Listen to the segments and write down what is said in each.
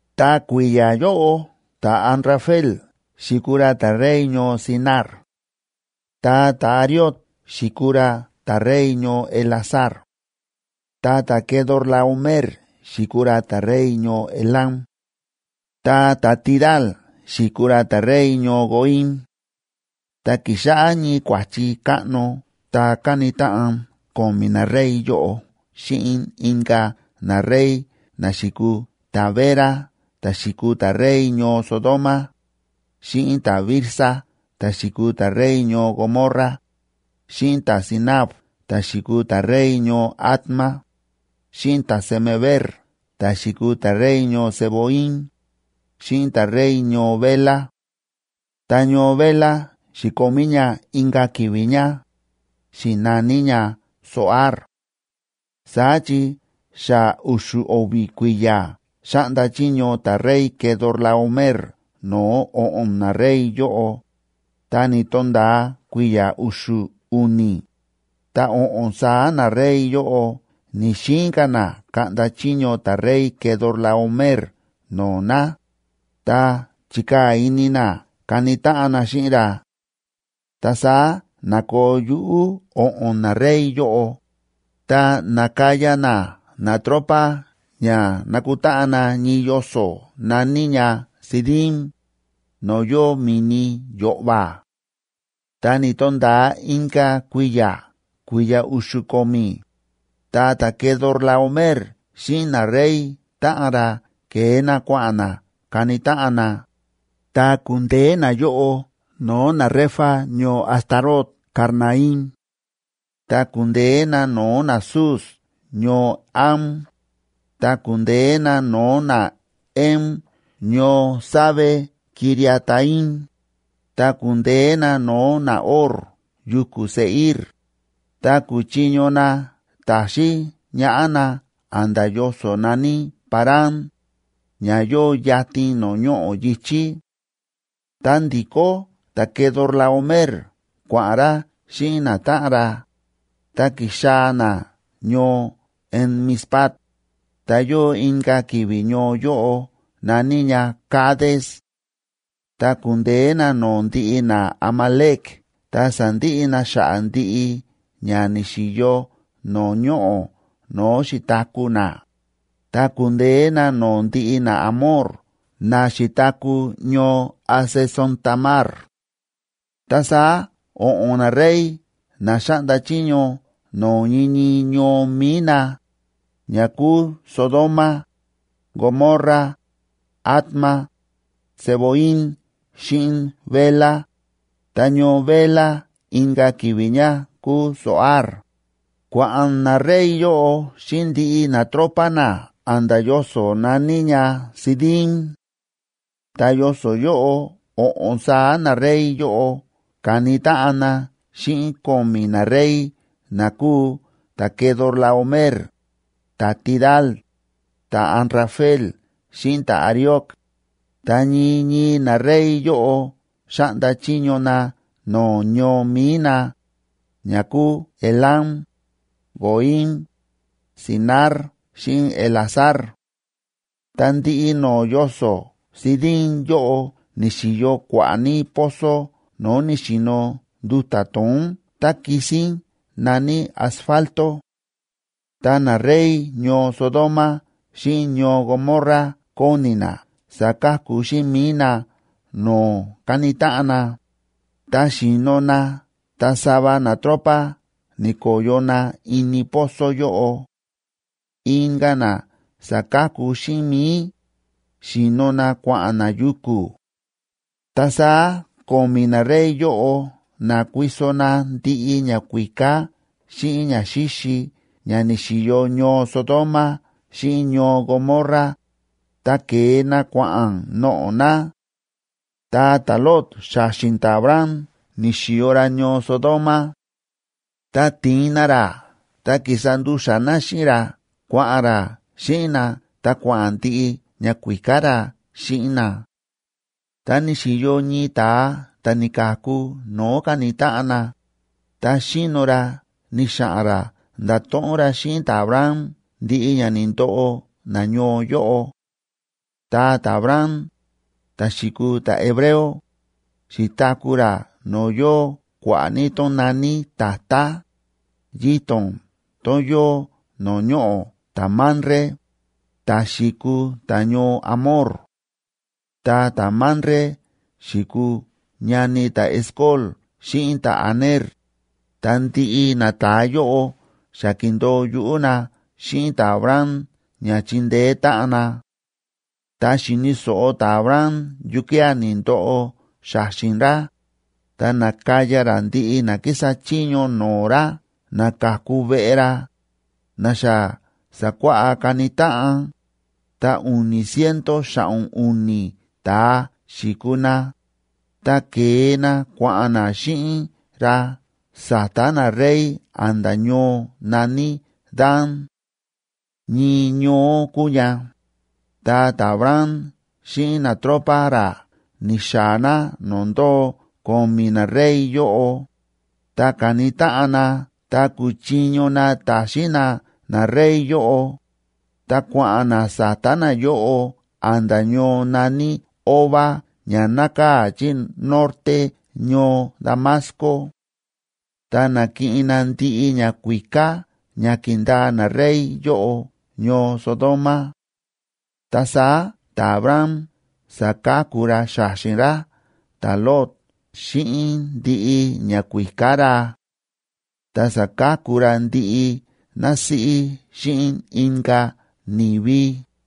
Ta kui̱ya̱ yóꞌo ta̱Amrafel xi̱kuu ra ta̱rey ñoo Sinar; ta ta̱Arioc xi̱kuu ra ta̱rey ñoo Elasar; ta ta̱Quedorlaomer xi̱kuu ra ta̱rey ñoo Elam; ta ta̱Tidal xi̱kuu ra ta̱rey ñoo Goim. Ta ki̱xáꞌá ñii kua̱chi káꞌno ta káni táꞌan ko̱mi̱ narey yóꞌo xíꞌin inka̱ narey na xi̱kuu ta̱Bera ta̱ xi̱kuu ta̱rey ñoo Sodoma, xíꞌin ta̱Birsa ta̱ xi̱kuu ta̱rey ñoo Gomorra, xíꞌin ta̱Sinab ta̱ xi̱kuu ta̱rey ñoo Adma, xíꞌin ta̱Semeber ta̱ xi̱kuu ta̱rey ñoo Zeboim, xíꞌin ta̱rey ñoo Bela. Ta ñoo Bela xi̱komí ña inka̱ ki̱vi̱ ña, xi̱naní ña Zoar. Saá chi xa u̱xu̱ o̱vi̱ kui̱ya̱ xáꞌnda chiño ta̱rey Quedorlaomer no̱o̱ o̱ꞌo̱n narey yóꞌo, ta ni̱to̱nda̱a kui̱ya̱ u̱xu̱ u̱ni̱, ta o̱ꞌo̱n saá narey yóꞌo ni̱‑xiin ka̱ na kaꞌnda chiño ta̱rey Quedorlaomer no̱o̱ na, ta chi̱kaa̱ ini na kani táꞌan na xíꞌin ra. Ta saá na̱koo yuꞌú o̱ꞌo̱n narey yóꞌo, ta na̱kaya na natropa ña nakutáꞌan na ñii yoso̱ na̱ní ña Sidim, no̱o̱ yóo Mi̱ni Yo̱ꞌva̱. Ta ni̱to̱nda̱a inka̱ kui̱ya̱, kui̱ya̱ u̱xu̱ ko̱mi̱, ta ta̱Quedorlaomer xíꞌin narey táꞌan ra ke̱e na kua̱ꞌa̱n na kani táꞌan na, ta ku̱ndeé nayóꞌo no̱o̱ naRefa ñoo Astarot Karnaim; ta ku̱ndeé na no̱o̱ naZuz ñoo Ham; ta ku̱ndeé na no̱o̱ naEm ñoo Save‑quiriataim, ta ku̱ndeé na no̱o̱ naHor yuku̱ Seir, ta ku̱chiño na ta̱xín ñaꞌá na a̱nda̱ yoso̱ na̱ní Parán, ña yóo yatin no̱o̱ ñoꞌo̱ yi̱chí. Ta ndi̱kó ta̱Quedorlaomer kua̱ꞌa̱n ra xíꞌin natáꞌan ra, ta ki̱xaa̱ na ñoo En‑mispat, ta yóo inka̱ ki̱vi̱ ñoo yóꞌo na̱ní ña Cades. Ta ku̱ndeé na no̱o̱ ndiꞌi naAmalec ta sa̱ndiꞌi na xa̱ꞌa̱ ndiꞌi ña ni̱xi̱yo no̱o̱ ñoꞌo̱ no̱o̱ xi̱taku̱ na, ta ku̱ndeé na no̱o̱ ndiꞌi naAmor na xi̱taku̱ ñoo Hazezontamar. Ta saá o̱ꞌo̱n narey na xáꞌnda chiño no̱o̱ ñii ñii ñoo mi̱i na, ña kúu Sodoma, Gomorra, Adma, Zeboim xíꞌin Bela, ta ñoo Bela inka̱ ki̱vi̱ ña kúu Zoar, kua̱ꞌa̱n narey yóꞌo xíꞌin ndiꞌi natropa na a̱nda̱ yoso̱ na̱ní ña Sidim. Ta yoso̱ yóꞌo o̱ꞌo̱n saá narey yóꞌo ka̱ni táꞌan na xíꞌin ko̱mi̱ narey na kúu ta̱Quedorlaomer, ta̱Tidal, ta̱Amrafel xíꞌin ta̱Arioc, ta ñii ñii narey yóꞌo xáꞌnda chiño na no̱o̱ ñoo mi̱i na, ña kúu Elam, Goim, Sinar xíꞌin Elasar. Ta ndiꞌi no̱o̱ yoso̱ Sidim yóꞌo ni̱xi̱yo kua̱ꞌa̱ ní pozo no̱o̱ ni̱xi̱no nduta̱ to̱ón tá kisín na̱ní asfalto. Ta narey ñoo Sodoma xíꞌin ñoo Gomorra kóni na saka̱ku xíꞌin mi̱i na no̱o̱ káni táꞌan na, ta xi̱no na ta sava natropa ni̱ko̱yo na ini pozo yóꞌo. Inka̱ na sa̱ka̱ku xíꞌin mi̱i, xi̱no na kua̱ꞌa̱n na yuku̱. Ta saá ko̱mi̱ narey yóꞌo na̱kuiso na ndiꞌi ñakuíká xíꞌin ñaxíxi ña ni̱xi̱yo ñoo Sodoma xíꞌin ñoo Gomorra, ta ke̱e na kua̱ꞌa̱n noꞌo̱ na. Ta ta̱Lot xa̱xi̱n ta̱Abram ni̱xi̱yo ra ñoo Sodoma; ta ti̱in na ra ta ki̱sa ndu̱xa̱ na xíꞌin ra kua̱ꞌa̱n ra xíꞌin na ta kua̱ꞌa̱n ndiꞌi ñakuíká ra xíꞌin na. Ta ni̱xi̱yo ñii ta̱a ta̱ ni̱ka̱ku no̱o̱ ka̱ni táꞌan na, ta xíno ra ni̱xa̱ꞌa̱n ra nda̱to̱ꞌon ra xíꞌin ta̱Abram ndiꞌi ña ni̱ndoꞌo nañoo yóꞌo. Ta ta̱Abram, ta̱ xi̱kuu ta̱hebreo, xi̱taku̱ ra no̱o̱ yóo kua̱ꞌa̱ ní tón na̱ní tatá, yito̱n tón yóo no̱o̱ ñoꞌo̱ ta̱Mamre, ta̱ xi̱kuu ta̱ñoo Amor. Ta ta̱Mamre xi̱kuu ñani ta̱Escol xíꞌin ta̱Aner, ta ndiꞌi nata̱a yóꞌo xa ki̱ndo̱o yuꞌú na xíꞌin ta̱Abram ña chindeé táꞌan na. Ta xi̱ni̱ so̱ꞌo ta̱Abram yukía̱ ni̱ndoꞌo xa̱xi̱n ra, ta na̱kaya ra ndiꞌi na kísa chiño no̱o̱ ra na ka̱ku veꞌe ra, na xa sa̱kuáꞌá kani táꞌan, ta u̱ni̱ ciento xa̱ꞌo̱n u̱ni̱ ta̱a xi̱kuu na, ta ke̱e na kua̱ꞌa̱n na xíꞌin ra sa̱ta̱ narey a̱nda̱ ñoo na̱ní Dan. Ñii ñoó kúu ña, ta ta̱Abram xíꞌin natropa ra ni̱xaa̱ na no̱o̱ ndóo ko̱mi̱ narey yóꞌo, ta ka̱ni táꞌan na ta ku̱chiño na ta̱xín na narey yóꞌo, ta kua̱ꞌa̱n na sa̱ta̱ nayóꞌo a̱nda̱ ñoo na̱ní Hoba ña nákaa̱ chí norte ñoo Damasco. Ta na̱kiꞌin na ndiꞌi ñakuíká ña ki̱ndaa narey yóꞌo ñoo Sodoma. Ta saá ta̱Abram sa̱ka̱ku ra xa̱xi̱n ra ta̱Lot xíꞌin ndiꞌi ñakuíká ra. Ta sa̱ka̱ku ra ndiꞌi násíꞌí xíꞌin inka̱ ni̱vi.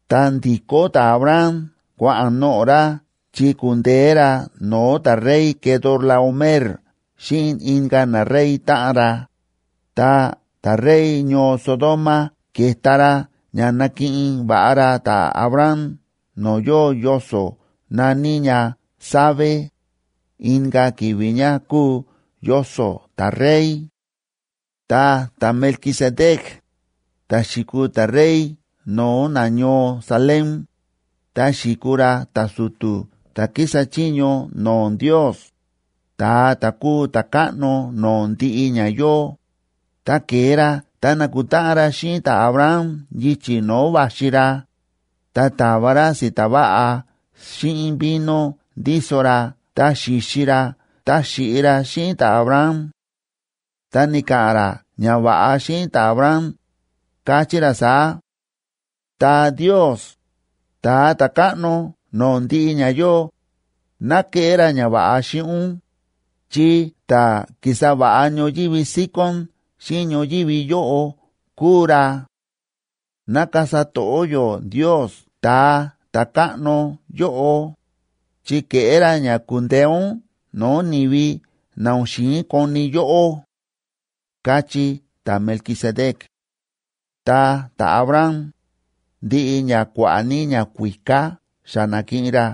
Ta ndi̱kó ta̱Abram kua̱ꞌa̱n noꞌo̱ ra chi ku̱ndeé ra no̱o̱ ta̱rey Quedorlaomer xíꞌin inka̱ narey táꞌan ra, ta ta̱rey ñoo Sodoma ke̱ta ra ña nakiꞌin va̱ꞌa ra ta̱Abram no̱o̱ yóo yoso̱ na̱ní ña Save, inka̱ ki̱vi̱ ña kúu Yoso̱ ta̱Rey. Ta ta̱Melquisedec, ta̱ xi̱kuu ta̱rey no̱o̱ nañoo Salem,a ta xi̱kuu ra ta̱su̱tu̱ ta̱ kísa chiño no̱o̱ Ndios, Ta̱a ta̱ kúu ta̱Káꞌno no̱o̱ ndiꞌi ña yóo, ta ke̱e ra ta na̱kutáꞌan ra xíꞌin ta̱Abram yichi̱ no̱o̱ va̱xi ra, ta ta̱va ra si̱ta̱ va̱ꞌa xíꞌin vino ndíso ra ta xi̱xi ra ta xi̱ꞌi ra xíꞌin ta̱Abram. Ta ni̱ka̱ꞌa̱n ra ñava̱ꞌa xíꞌin ta̱Abram, káchí ra saá: Ta Ndios, Ta̱a ta̱Káꞌno no̱o̱ ndiꞌi ña yóo, ná keꞌé ra ñava̱ꞌa xíꞌin ún, chi ta̱ ki̱sa va̱ꞌa ñoyívi síkón xíꞌin ñoyívi yóꞌo kúu ra; ná kasa to̱ꞌó yó Ndios Ta̱a ta̱Káꞌno yóꞌo, chi ke̱ꞌé ra ña ku̱ndeé ún no̱o̱ ni̱vi na o̱n xi̱in koni yóꞌó, káchí ta̱Melquisedec. Ta ta̱Abram, ndiꞌi ña kua̱ꞌa̱ ní ñakuíká xa na̱kiꞌin ra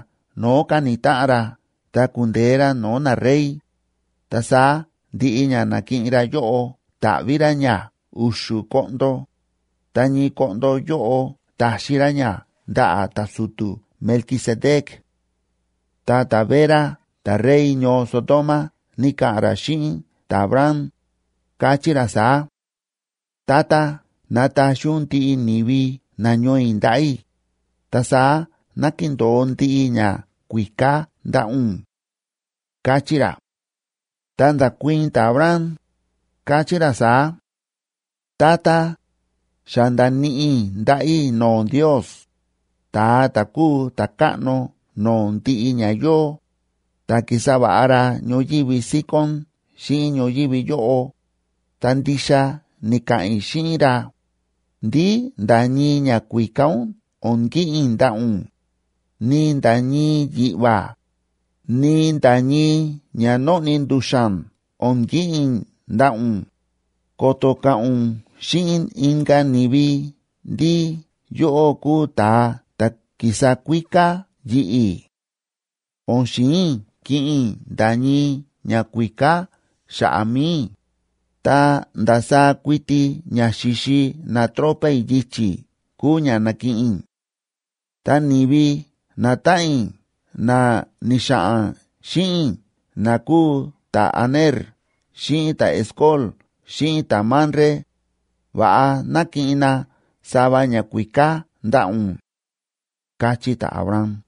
no̱o̱ ka̱ni táꞌan ra tá ku̱ndeé ra no̱o̱ narey, ta saá ndiꞌi ña na̱kiꞌin ra yóꞌo ta̱ꞌví ra ña u̱xu̱ koꞌndo, ta ñii koꞌndo yóꞌo ta̱xi ra ña ndaꞌa̱ ta̱su̱tu̱ Melquisedec. Ta ta̱Bera ta̱rey ñoo Sodoma ni̱ka̱ꞌa̱n ra xíꞌin ta̱Abram, káchí ra saá: ―Tata, nataxi ún ndiꞌi ni̱vi nañoo i̱ ndaꞌa̱ i̱, ta saá ná kindo̱o ndiꞌi ñakuíká ndaꞌa̱ ún ―káchí ra. Ta nda̱kuii̱n ta̱Abram, káchí ra saá: ―Tata, xa nda̱níꞌi i̱ ndaꞌa̱ i̱ no̱o̱ Ndios,b Ta̱a ta̱ kúu ta̱Káꞌno no̱o̱ ndiꞌi ña yóo, ta ki̱sa va̱ꞌa ra ñoyívi síkón xíꞌin ñoyívi yóꞌo, ta ndixa ni̱ka̱ꞌa̱n i̱ xíꞌin ra, ndí nda̱ ñii ñakuíká ún o̱n kiꞌin i̱ ndaꞌa̱ ún, ni nda̱ ñii yiꞌva̱, ni nda̱ ñii ña nóꞌni ndu̱xa̱n o̱n kiꞌin i̱ ndaꞌa̱ ún, ko̱to̱ ka̱ꞌa̱n ún xíꞌin inka̱ ni̱vi ndí yóꞌó kúu ta̱a ta̱ ki̱sa kuíká yi̱ꞌi̱. O̱n xi̱in i̱ kiꞌin i̱ nda̱ ñii ñakuíká xa̱ꞌa̱ mi̱i i̱, ta ndasaá kuiti ña xi̱xi natropa i̱ yichi̱ kúu ña na̱kiꞌin i̱. Ta ni̱vi natáꞌan i̱ na ni̱xa̱ꞌa̱n xíꞌin i̱ na kúu ta̱Aner xíꞌin ta̱Escol xíꞌin ta̱Mamre, va̱ꞌa ná kiꞌin na sava ñakuíká ndaꞌa̱ ún ―káchí ta̱Abram.